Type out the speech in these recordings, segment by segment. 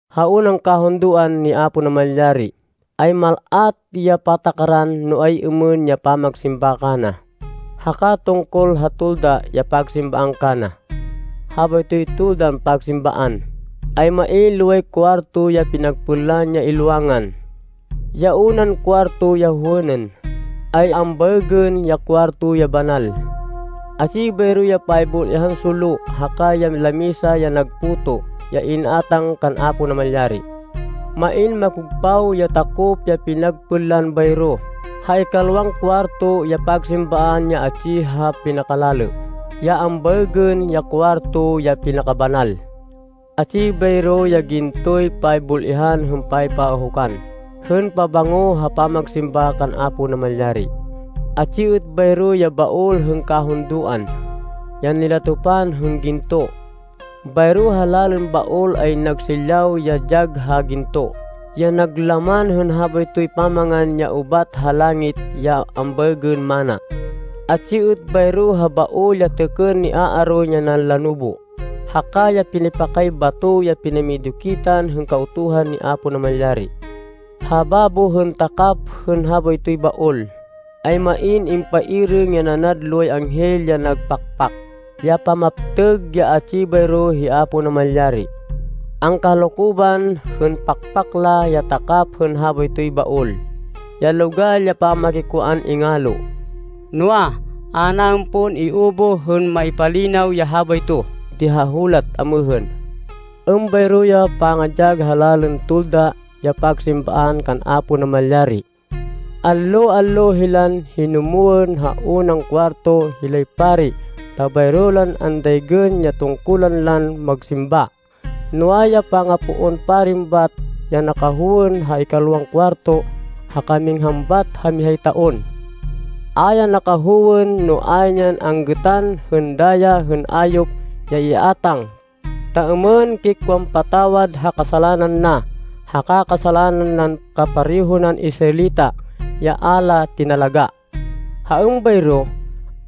Ha unan kahundoan ni Apo Namalyari, ay mal-at ya patakaran no ay-êmên ya pamagsimba kana, haka tungkol ha tolda ya pagsimbaan kana. Habaytoy toldan pagsimbaan, ay main loway kuwarto ya pinagpênlan ya ilwangan. Ya unan kuwarto ya howênên, ay ambaêgên Kuwarto ya Banal. Atsi bayro ya paybul-ihan solo, haka ya lamisa ya nag puto, ya in-átang kan Apo Namalyari. Main makogpaw ya takop ya pinagpênlan bayro ha ikalwan kuwarto ya pagsimbaan ya atsi ha pinakalalê, ya ambaêgên Kuwarto ya Pinakabanal. Atsi bayro ya gintoy paybul-ihan hên paypaahukan hên pabango ha pamagsimba kan Apo Namalyari. Atsi êt bayro ya Baol hên Kahundoan, ya nilatopan hên ginto. Bayro ha lalên Baol ay nag silyaw ya dyag ha ginto ya nag laman hên habaytoy pamangan ya ubat ha langit ya ambaêgên manna. Atsi êt bayro ha Baol ya têkên ni Aaron ya nanlanubu, haka ya pinipakay bato ya pinamidukitan hên Kautuhan ni Apo Namalyari. Ha babo hên takap hên habaytoy Baol, ay main impairêng ya nanad loway anghel ya nag pakpak, ya pamaptêg ya atsi bayro hi Apo Namalyari. Angkahalokoban hên pakpak la ya takap hên habaytoy Baol, ya logal ya pamakikwaan ingalo. Noa, a naên pon iubuh hên maipalinaw ya habayto di ha hulat amêhên. Êmbayro ya pangadyag ha lalên tolda ya pagsimbaan kan Apo Namalyari. Allo-allo hilan hinumwên ha unan kuwarto hilay pari ta bayro lan andaygên ya tungkulan lan magsimba. Noa, ya pinakapoon pari bat ya nakahowên ha ikalwan kuwarto haka minghan bat ha mihay taon. A ya nakahowên no ayn yan anggêtan hên daya hên ayop ya iátang, ta êmên kikwan patawad ha kasalanan na, haka kasalanan nan kapareho nan Israelita, ya a la tinalagá. Ha êmbayro,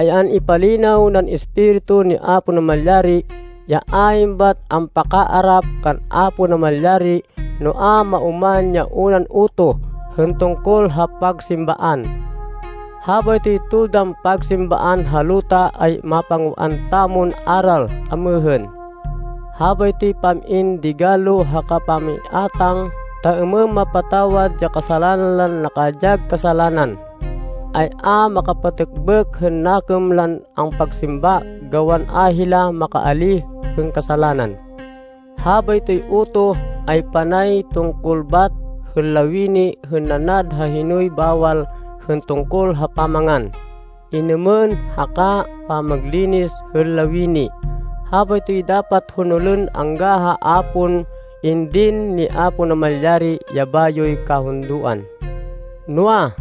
ay an-ipalinaw nan Espiritu ni Apo Namalyari, ya ayn bat ampakaarap kan Apo Namalyari no a maoman ya unan utoh hên tungkol ha pagsimbaan. Habaytoy toldan pagsimbaan ha luta ay mapangwaan tamon aral amêhên. Habaytoy pam-in digalo haka pangiátang ta êmên mapatawad ya kasalanan lan nakadyag kasalanan, ay a makapatêkbêk hên nakêm lan ampagsimba gawan a hila makaalíh hên kasalanan. Habaytoy utoh ay panay tungkol bat hên lawini hên nanad ha hinoy bawal hên tungkol ha pamangan, inêmên haka pamaglinis hên lawini. Habaytoy dapat honolên angga ha a pon indin ni Apo Namalyari ya bayoy kahundoan. Noa,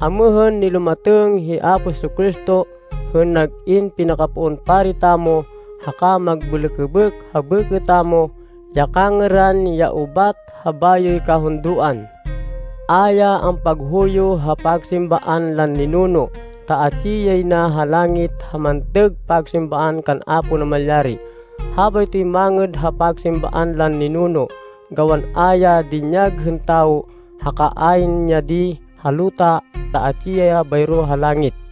amêhên nilumatêng hi Apo Jesu-Cristo, hên nag-in pinakapoon pari tamo haka magbêlêkêbêk ha bêkê tamo ya kangêran ya ubat ha bayoy kahundoan. A ya ampaghuyo ha pagsimbaan lan ninuno, ta atsi yay na ha langit ha mantêg pagsimbaan kan Apo Namalyari. Habaytoy mangêd ha pagsimbaan lan ninuno gawan a ya dinyag hên tawo haka ayn ya di ha luta ta atsi ya bayro ha langit.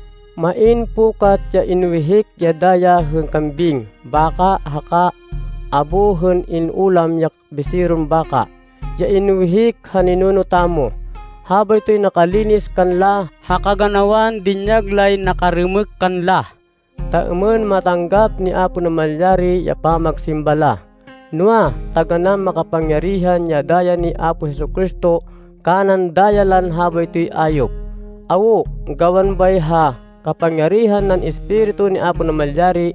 Main pukat ya inwihik ya daya hên kambing, baka haka abo hên in-ulam ya biseron baka, ya inwihik ha ninuno tamo. Habaytoy nakalinis kanla ha kaganawan dinyag lay nakarêmêk kanla, ta êmên matanggap ni Apo Namalyari ya pamagsimba la. Noa, taganán makapangyarihan ya daya ni Apo Jesu-Cristo kanan daya lan habaytoy ayop. Awo, gawan bay, ha kapangyarihan nan Espiritu ni Apo Namalyari,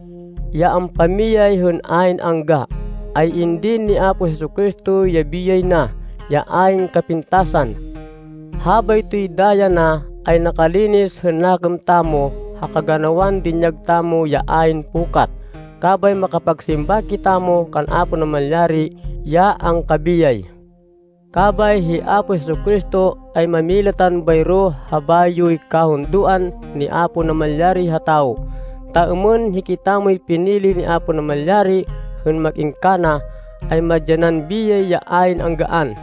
ya ampamiyay hên ayn angga, ay indin ni Apo Jesu-Cristo ya biyay na, ya ayn kapintasan. Habaytoy daya na ay nakalinis hên nakêm tamo ha kaganawan dinyag tamo ya ayn pukat. Kabay makapagsimba kitamo kan Apo Namalyari ya angkabiyay. Kabay hi Apo Jesu-Cristo ay mámilatan bayro ha bayoy kahundoan ni Apo Namalyari ha tawo, ta êmên hikitamoy pinili ni Apo Namalyari hên mag-in kana, ay madyanan biyay ya ayn anggaan.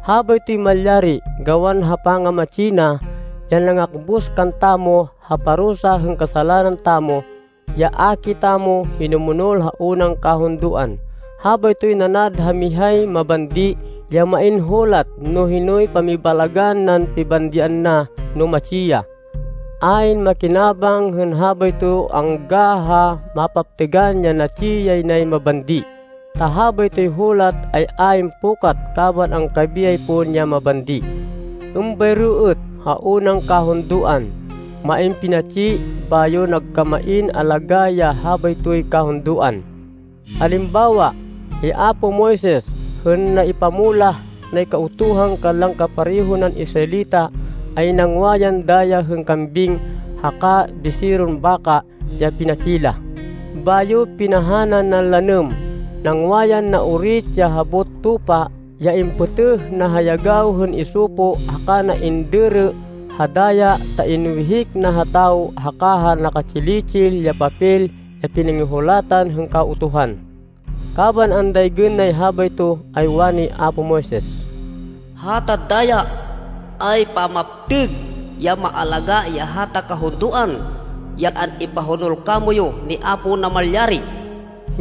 Habaytoy malyari gawan ha pangamatsi na, ya nangakbus kantamo ha parusa hên kasalanan tamo, ya a kitamo hinumonol ha unan kahundoan. Habaytoy nanad ha mihay mabandi ya main hulat no hinoy pamibalagan nan pibandian na no matsi ya. Ayn makinabang hên habayto angga ha mapaptêgan ya natsi yay nay mabandi, ta habaytoy hulat ay ayn pukat kaban angkabiyay pon ya mabandi. Êmbayro êt ha unan kahundoan, main pinatsi, bayo nagkamain alagá ya habaytoy kahundoan. Alimbawa hi apo Moises hên naipamulah nay Kautuhan kanlan kapareho nan Israelita, ay nangwa yan daya hên kambing haka biseron baka ya pinatsi la, bayo pinahanan nan lanêm. Nangwa yan naorit ya habot tupa ya impêtêh na ha yagaw hên isopo haka na indêrê ha daya ta inwihik na ha tawo haka ha naka-tsili-tsil ya papel ya pinangihulatan hên Kautuhan. Kaban andaygên nay habayto ay wani apo Moises, “Hata daya ay pamaptêg ya maalagá ya hata kahundoan ya an-ipahonol kamoyu ni Apo Namalyari.”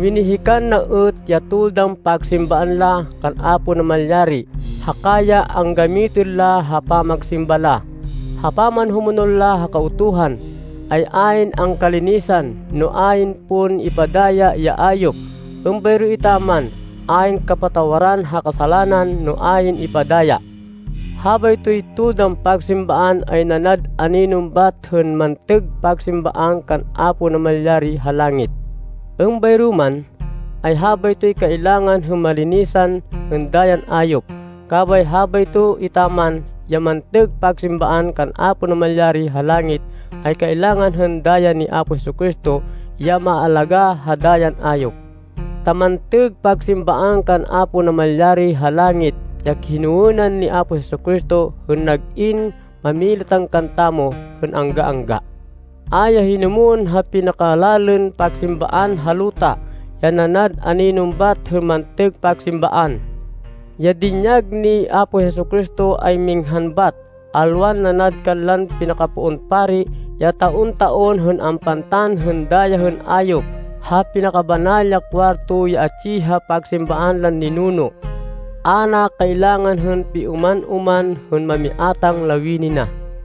Winihikan na êt ya toldan pagsimbaan la kan Apo Namalyari haka ya anggamitên la ha pamagsimba la. Ha pamanhumonol ha Kautuhan, ay ayn angkalinisan, no ayn pon ipadaya ya ayop. Êmbayro etaman ayn kapatawaran ha kasalanan no ayn ipadaya. Habaytoy toldan pagsimbaan ay nanad aninon bat hên mantêg pagsimbaan kan Apo Namalyari ha langit. Êmbayro man, ay habaytoy kailangan hên malinisan hên dayan ayop, kabay habayto etaman ya mantêg pagsimbaan kan Apo Namalyari ha langit, ay kailangan hên daya ni Apo Jesu-Cristo ya maalagá ha dayan ayop. Ta mantêg pagsimbaan kan Apo Namalyari ha langit ya hinowênan ni Apo Jesu-Cristo hên nag-in mámilatan kantamo hên angga-angga. A ya hinumwên ha pinakalalên pagsimbaan ha luta, ya nanad aninon bat hên mantêg pagsimbaan. Ya dinyag ni Apo Jesu-Cristo, ay minghan bat, alwan nanad kanlan pinakapoon pari ya taon-taon hên ampantan hên daya hên ayop ha Pinakabanal ya Kuwarto ya atsi ha pagsimbaan lan ninuno. A na kailangan hên pioman-oman hên mamiátang lawini na.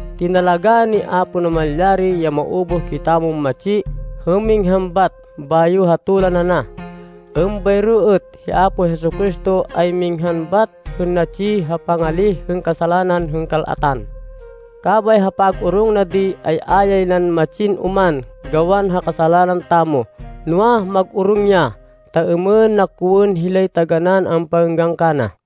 Tinalagá ni Apo Namalyari ya maubuh kitamon matsi hên minghan bêngat, bayo hatolan ana. Êmbayro êt hi Apo Jesu-Cristo ay minghan bat hên natsi ha pangalíh hên kasalanan hên kal-atan. Kabay ha pag-orong na di ay a yay nan matsin oman gawan ha kasalanan tamo, noa, mag-orong ya, ta êmên na kowên hilay taganán ampangênggan kana.